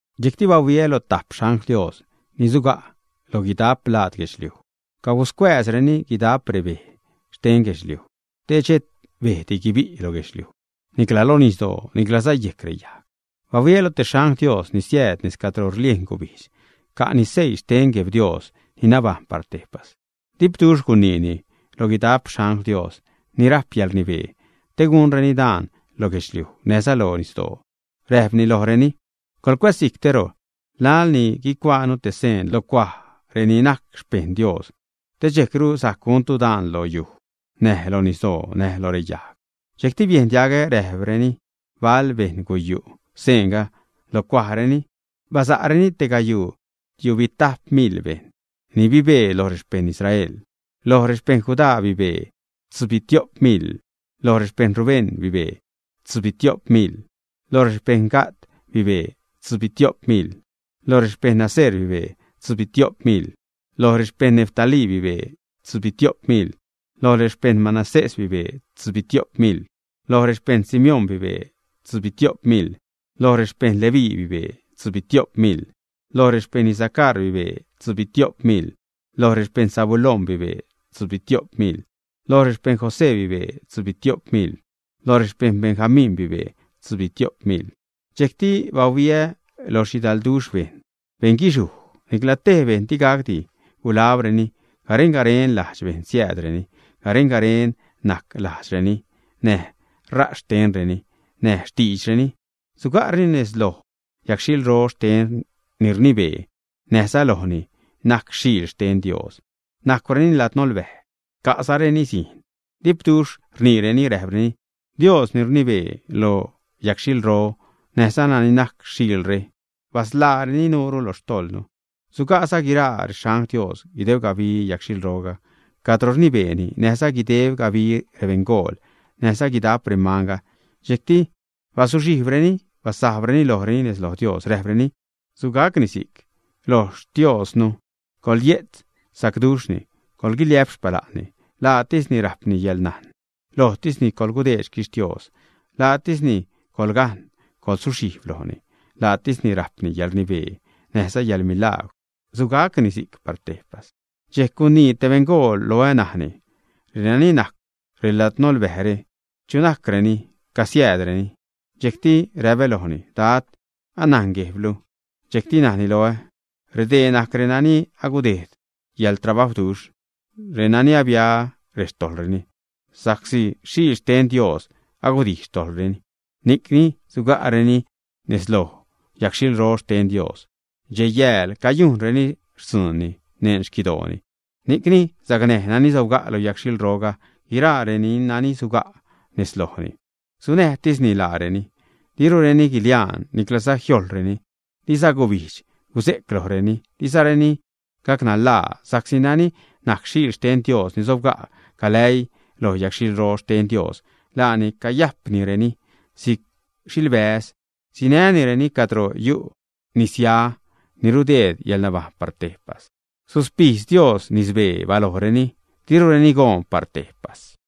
Dxejcti bahuiä lo tajp xangl Dios ni suga' loj guidajp laad guedxliuj. Caguscuääzreni guidajp rebej xten guedxliuj te xhet bejdi guibi' lo guedxliuj nicla lo nisdoo niclaza yejc reyajg. Bahuiä lo stee xangl Dios, ni siääd nez cadro rliejn gubijdx, ca'ni seii xten Gueb Dios ni nabajṉ par tejpas. Dipduxh guniini lo guidap xangl Dios ni rajp yäḻrnibee te gunreni daan lo guedxliuj, näjza lo nisdoo. Räjpni lojreni: ―Guläzsijctero, laḻ ni guicuaanu te seen lo cuaj reni najc xpejṉ Dios, te dxejcru sajc guntu daan lo yuj, näj loj nisdoo, näj loj reyajg. Dxejcti biejn diagä najreni bal bejṉ guyu' seenga lo cuajreni, basa'reni tegayuu tiubitajp miḻ bejṉ ni bibee loj rexpejṉ Israel. Loj rexpejṉ Judá bibee tzubitio'p miḻ; loj rexpejṉ Rubén bibee tzubitio'p miḻ; loj rexpejṉ Gad bibee tzubitio'p miḻ; loj rexpejṉ Aser bibee tzubitio'p miḻ; loj rexpejṉ Neftalí bibee tzubitio'p miḻ; loj rexpejṉ Manasés bibee tzubitio'p miḻ; loj rexpejṉ Simeón bibee tzubitio'p miḻ; loj rexpejṉ Leví bibee tzubitio'p miḻ; loj rexpejṉ Isacar bibee tzubitio'p miḻ; loj rexpejṉ Zabulón bibee tzubitio'p miḻ; loj rexpejṉ José bibee tzubitio'p miḻ; loj rexpejṉ Benjamín bibee tzubitio'p miḻ. Dxejcti bahuiä lo xhidalduxh bejṉ, beṉguixhuj, nicla tej bejṉ digacdi gulabreni. Garen-garen ladx-bejṉ siäädreni, garen-garen najc lajdxreni, näj ṟaz xtenreni, näj xtiidxreni. Suga'reni nez loj yagxhilro xten ni rnibee, näjza nez lojni ni najc Xiil xten Dios. Najcwreni ladnolbäj, ca'zareni zijṉ. Dipduxh rniireni, räjpreni: Dios ni rnibee lo yagxhilro, näjza nani najc Xiilre, basḻaareni nuure lo xtojḻnu. Suga'za guiraa rexangl Dios guideb gabi yagxhilro cadro rnibeeni, näjza guideb gabi rebeṉgool näjza guidap remanga, dxejcti bazuxhijbreni, basajbreni lojreni nez lo Dios, räjpreni: Sugacni si'c. Loj Xtiostisnu coḻye'tz sacduxhni; coḻguiliä'p xpala'nni; laatisni rajpni yäḻnajn; lojtisni coḻgudeed xquixhtios, laatisni coḻgaṉ, coḻsuxhijb lojni; laatisni rajpni yäḻrnibee näjza yäḻmilagwr. Sugacni si'c par tejpas. Dxejc gunii te beṉgool loä, najni: ―Renani najcw reladnolbäjre, ¿chu najcreni? ¿Casiäädreni? Dxejcti räpä lojni: ―Dad, anajn Guejblu. Dxejc najni loä: ―Redee najc renani agudejd yäḻtrabajwduxh, renani abia rextojḻreni sa'csi xtiejn Xiil xten Dios agudijx xtojḻreni. Ni'cni suga'reni nez loj yagxhilro xten Dios dxej-yääl cayujnreni xtzuunni neṉ xquidooni. Ni'cni sacnäj nani sobga' lo yagxhilroga guiraa renani suga' nez lojni, sunäjtisni laareni. Dirureni guiliaan, niclaza jiojḻreni, diza gubijdx guze'c lojreni, dizareni gacnanlaa. Sa'csi nani najc Xiil xten Dios ni sobga' galäii loj yagxhilro xten Dios, laani cayajpnireni si'c xilbäz, sinänireni cadro yu' nisya ni rudeed yäḻnabajṉ par tejpas. Suspijdz Dios nisbee balojreni, dirureni goon par tejpas.